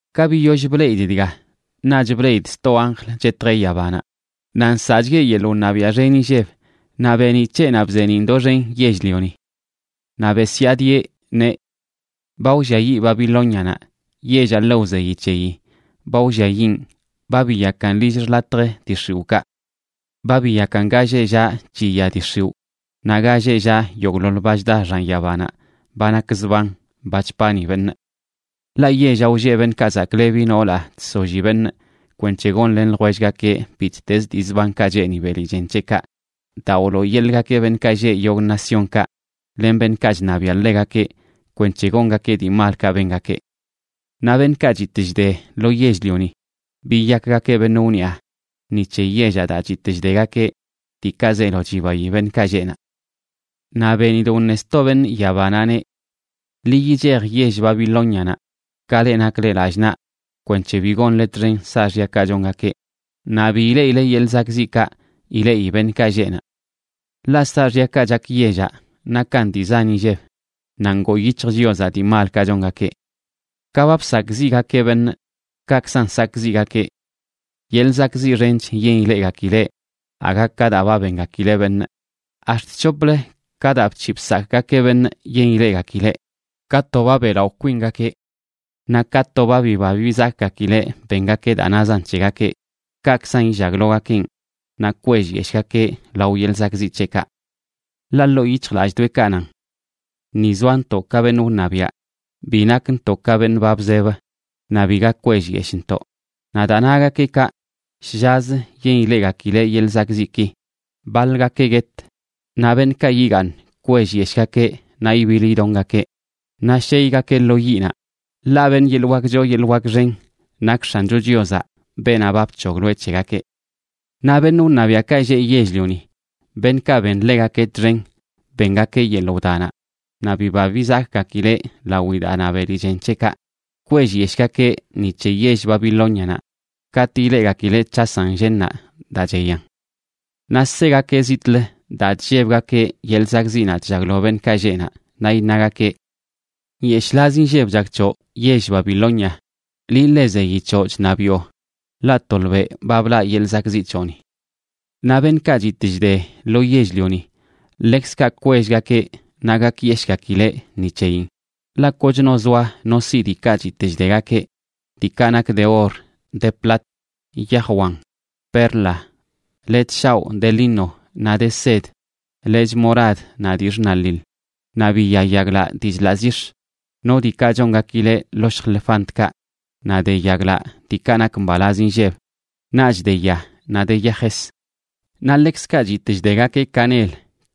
Ka biyoll bleꞌidꞌ dga, naꞌch bleꞌidꞌ sto anjl chetjeꞌ yabanaꞌ, naꞌ nsaꞌchgueꞌ yeḻꞌ wṉabiaꞌ xen inlleb, naꞌ beeniꞌ c̱heꞌnaꞌ bzeeniꞌn doxen yell-lioni. Naꞌ besyaadieꞌ neꞌ: ―¡Ba wlliayiꞌ Babilónianaꞌ, yellaꞌ ḻe wzeyi c̱heyi! ¡Ba wlliayiꞌn! Ba biyakan lill xḻatjə dii x̱iwꞌkaꞌ. Ba biyakan ga lleꞌ llaꞌ chiya dii x̱iwꞌ naꞌ ga lleꞌ llaꞌ yogꞌḻoḻ ba chda xan yabanaꞌ ba nak zban, ba chpani beṉꞌ. Ḻaꞌ yellaꞌ wlleꞌ beṉꞌkaꞌ zaklebi noolaꞌ chsolli beṉꞌ kwenc̱he gonlen ljwellgakeꞌ bittez dii zbankaꞌ cheeni beli chen c̱heꞌkaꞌ, daa wlooyeḻꞌgakeꞌ beṉꞌkaꞌ lleꞌ yogꞌ naciónkaꞌ len beṉꞌkaꞌ chṉabiaꞌ ḻegakeꞌ kwenc̱he gongakeꞌ dii malkaꞌ bengakeꞌ. Naꞌ beṉꞌkaꞌ chitꞌ chde lo yell-lioni biyakgakeꞌ beṉꞌ wniꞌa ni c̱he yellaꞌ daa chitꞌ chdegakeꞌ diikaꞌ zeelo chibayi beṉꞌkaꞌ lleꞌ naꞌ. Naꞌ benidꞌ wṉe sto beṉꞌ yabanaꞌ, neꞌ: ―Ḻi yichej yell Babilónianaꞌ, ka leꞌ nakle lallꞌ naꞌ, kwenc̱he bi gonle txen saaxyakaꞌ chongakeꞌ, naꞌ bi ileꞌileꞌ yeḻꞌ zakꞌziꞌkaꞌ ileꞌi beṉꞌkaꞌ lleꞌ naꞌ. Ḻaꞌ saaxyakaꞌ chak yellaꞌ nakan dii zan inlleb, naꞌ ngoo yic̱hj Chiozaꞌ dii malkaꞌ chongakeꞌ. Ka ba bsakꞌziꞌgakeꞌ beṉꞌ, kaꞌkzan sakꞌziꞌgakeꞌ. Yeḻꞌ zakꞌziꞌ xench yen ileꞌgakileꞌ aga ka daa ba bengakileꞌ beṉꞌ, ax̱t c̱hoplə ka daa bc̱hiꞌ bsakꞌgakeꞌ beṉꞌ yen ileꞌgakileꞌ. Ka to ba beꞌlaꞌo kwingakeꞌ naꞌ ka to ba biba bizakgakileꞌ bengakeꞌ daa nazan c̱hegakeꞌ, kaꞌkzan illaglogakenꞌ naꞌ kwellyeshꞌgakeꞌ lao yeḻꞌ zakꞌziꞌ c̱heꞌkaꞌ. Ḻaꞌ ḻoo yic̱hjlallꞌdoꞌekaꞌ nan: “Ni zoantoꞌ ka beṉꞌ wṉabiaꞌ. Bi nakntoꞌ ka beṉꞌ ba bzeb naꞌ biga kwellyeshꞌntoꞌ.” Naꞌ daa nagakeꞌkaꞌ, shllazə yen ileꞌgakileꞌ yeḻꞌ zakꞌziꞌki: baḻgakeꞌ guet, naꞌ beṉꞌkaꞌ yigaaṉ kwellyeshꞌgakeꞌ naꞌ ibiḻ idongakeꞌ, naꞌ sheygakeꞌ lo yiꞌnaꞌ, ḻaꞌ beṉꞌ yeḻꞌ wak choo yeḻꞌ wak xen nak X̱ancho Chiozaꞌ, beenaꞌ ba bc̱hogloeꞌ c̱hegakeꞌ. Naꞌ beṉꞌ wṉabiaꞌkaꞌ lleꞌ yell-lioni beṉꞌkaꞌ ben ḻegakeꞌ txen bengakeꞌ yeḻꞌ wdanaꞌ naꞌ biba bizakgakileꞌ lawi daa na beli chen c̱heꞌkaꞌ, kwellyeshꞌgakeꞌ ni c̱he yell Babilónianaꞌ katꞌ ileꞌgakileꞌ c̱hasan llennaꞌ daa cheyan. Naꞌ segakeꞌ zitꞌlə daa chllebgakeꞌ yeḻꞌ zakꞌziꞌnaꞌ chllaglo beṉꞌkaꞌ lleꞌ naꞌ, naꞌ iṉagakeꞌ: ―¡Nyeshꞌlaz inlleb chak c̱hoꞌ, yell Babilonia, liꞌ ḻe zeyi c̱hoꞌ chṉabiꞌo! Ḻaꞌ tolbeꞌ ba blaꞌ yeḻꞌ zakꞌziꞌ c̱hoꞌni. Naꞌ beṉꞌkaꞌ chitꞌ chde lo yell-lioni ḻekzkaꞌ kwellgakeꞌ naꞌ gakyeshꞌgakileꞌ ni c̱heyin, ḻaꞌ kochno zoa no siꞌ diikaꞌ chitꞌ chdegakeꞌ, diikaꞌ nak de or, de plat, yaj wan, perla, lechꞌ shaoꞌ de lino naꞌ de sed, lechꞌ morad naꞌ dii xṉaḻiḻ, naꞌ biya yaglaꞌ dii chḻaꞌ zix̱, no diikaꞌ chongakileꞌ ḻoshj lefantkaꞌ naꞌ de yaglaꞌ diikaꞌ nak mbalaz inlleb, naꞌch de ya, naꞌ de yajes. Naꞌ ḻekzkaꞌ chitꞌ chdegakeꞌ canel,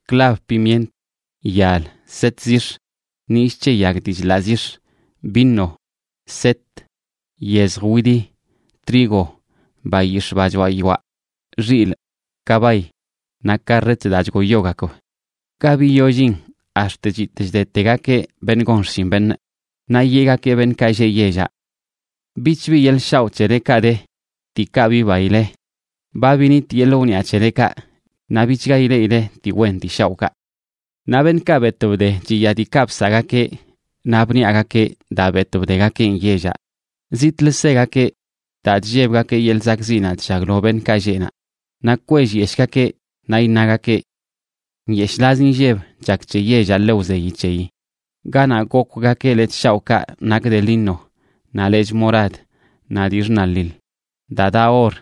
clab pimient, yal, set zix̱, nillꞌ c̱he yag dii chḻaꞌ zix̱, vino, set, yezj widi, trigo, bayix̱ꞌ ba choaꞌ yoaꞌ, xilꞌ, kabay naꞌ karret daa chgoyogakb, ga biyollin ax̱t chitꞌ chdetegakeꞌ beṉꞌ gon xshin beṉꞌ. Naꞌ yeꞌgakeꞌ beṉꞌkaꞌ lleꞌ yellaꞌ: ―Bichbi yeḻꞌ shaoꞌ c̱helekaꞌ de, diikaꞌ bibaile. Ba binit yeḻꞌ wniꞌa c̱helekaꞌ naꞌ bichga ileꞌileꞌ dii wen dii shaoꞌkaꞌ. Naꞌ beṉꞌkaꞌ betꞌ bde chiya diikaꞌ bsaꞌgakeꞌ naꞌ bniꞌagakeꞌ daa betꞌ bdegakeꞌn yellaꞌ, zitꞌlə segakeꞌ daa chllebgakeꞌ yeḻꞌ zakꞌziꞌnaꞌ chllaglo beṉꞌkaꞌ lleꞌ naꞌ, naꞌ kwellyeshꞌgakeꞌ. Naꞌ iṉagakeꞌ: ―¡Nyeshꞌlaz inlleb chak c̱he yellaꞌ ḻe wzeyi c̱heyi, ganaꞌ gokwgakeꞌ lechꞌ shaoꞌkaꞌ nak de lino, naꞌ lechꞌ morad naꞌ dii xṉaḻiḻ, daa daꞌ or,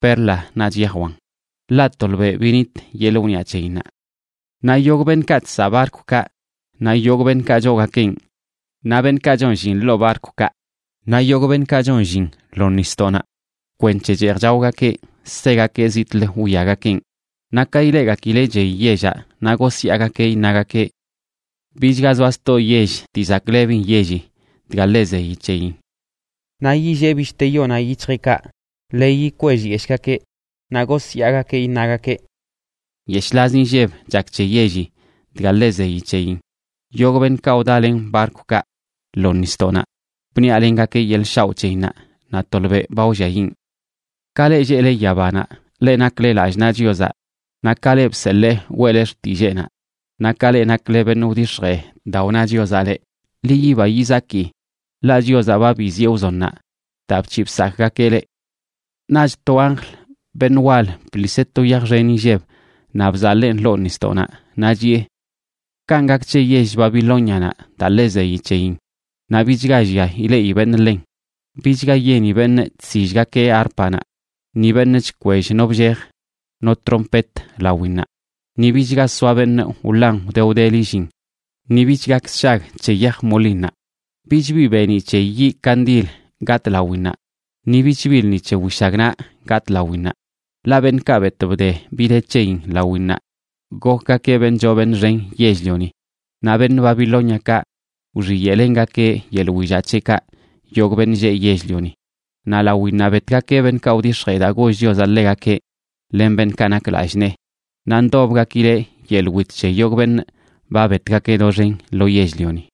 perla naꞌch yaj wan! ¡Ḻaꞌ tolbeꞌ binit yeḻꞌ wniꞌa c̱heyinnaꞌ! Naꞌ yogꞌ beṉꞌkaꞌ chsaꞌ barkwkaꞌ, naꞌ yogꞌ beṉꞌkaꞌ choogakeꞌn, naꞌ beṉꞌkaꞌ chon llin ḻoo barkwkaꞌ, naꞌ yogꞌ beṉꞌkaꞌ chon llin lo nisdoꞌnaꞌ kwenc̱he cheej chaogakeꞌ, segakeꞌ zitꞌlə wwiagakeꞌn. Naꞌ ka ileꞌgakileꞌ chey yellaꞌ naꞌ gosyaagakeꞌ, iṉagakeꞌ: ―¡Bichga zoa sto yell dii zaklebin yelli dga ḻe zeyi c̱heyin! Naꞌ yillee bishte yonaꞌ yic̱hjeꞌkaꞌ, leyi kwellyeshꞌgakeꞌ, naꞌ gosyaagakeꞌ iṉagakeꞌ: ―¡Nyeshꞌlaz inlleb chak c̱he yelli dga ḻe zeyi c̱heyin! Yogꞌ beṉꞌkaꞌ wdalen barkwkaꞌ lo nisdoꞌnaꞌ bniꞌalengakeꞌ yeḻꞌ shaoꞌ c̱heyinnaꞌ. ¡Naꞌ tolbeꞌ ba wlliayiꞌn! Ka leꞌ lleꞌle yabanaꞌ, leꞌ nakle lallꞌ naꞌ Chiozaꞌ, naꞌ ka leꞌ bseḻee weꞌle xtilleenaꞌ, naꞌ ka leꞌ nakle beṉꞌ wdix̱jee daa wna Chiozaꞌ leꞌ, ḻi yiba yizaki, ḻaꞌ Chiozaꞌ ba biziꞌe wzonnaꞌ daa bc̱hiꞌ bsakꞌgakeꞌ leꞌ. Naꞌch to anjl, beṉꞌ wal, bḻiseꞌ to yaj xen inlleb naꞌ bzaḻeen ḻoo nisdoꞌnaꞌ, naꞌ chiꞌe: ―Kanꞌ gak c̱he yell Babilónianaꞌ daa ḻe zeyi c̱heyin, naꞌ bichga llia ileꞌi beṉꞌ ḻen. Bichga yeni beṉꞌ chsillgakeꞌ árpanaꞌ, ni beṉꞌ chkwell no bllej no trompet lawinnaꞌ. Ni bichga soa beṉꞌ wḻan wde wdeli llin, ni bich gak sshag c̱he yaj molinnaꞌ. Bich bi beeniꞌ c̱he yiꞌ kandil gatꞌ lawinnaꞌ, ni bich bi lṉi c̱he wishagnaꞌ gatꞌ lawinnaꞌ. Ḻaꞌ beṉꞌkaꞌ betꞌ bde bi de c̱heyin lawinnaꞌ gokgakeꞌ beṉꞌ choo beṉꞌ xen yell-lioni, naꞌ beṉꞌ Babilóniakaꞌ wxiyeꞌlengakeꞌ yeḻꞌ willaꞌ c̱heꞌkaꞌ yogꞌ beṉꞌ lleꞌ yell-lioni. Naꞌ lawinnaꞌ betgakeꞌ beṉꞌkaꞌ wdix̱jee daa goll Chiozaꞌ ḻegakeꞌ len beṉꞌkaꞌ nak lallꞌ nee, naꞌ ndobgakileꞌ yeḻꞌ wit c̱he yogꞌ beṉꞌ ba betgakeꞌ doxen lo yell-lioni.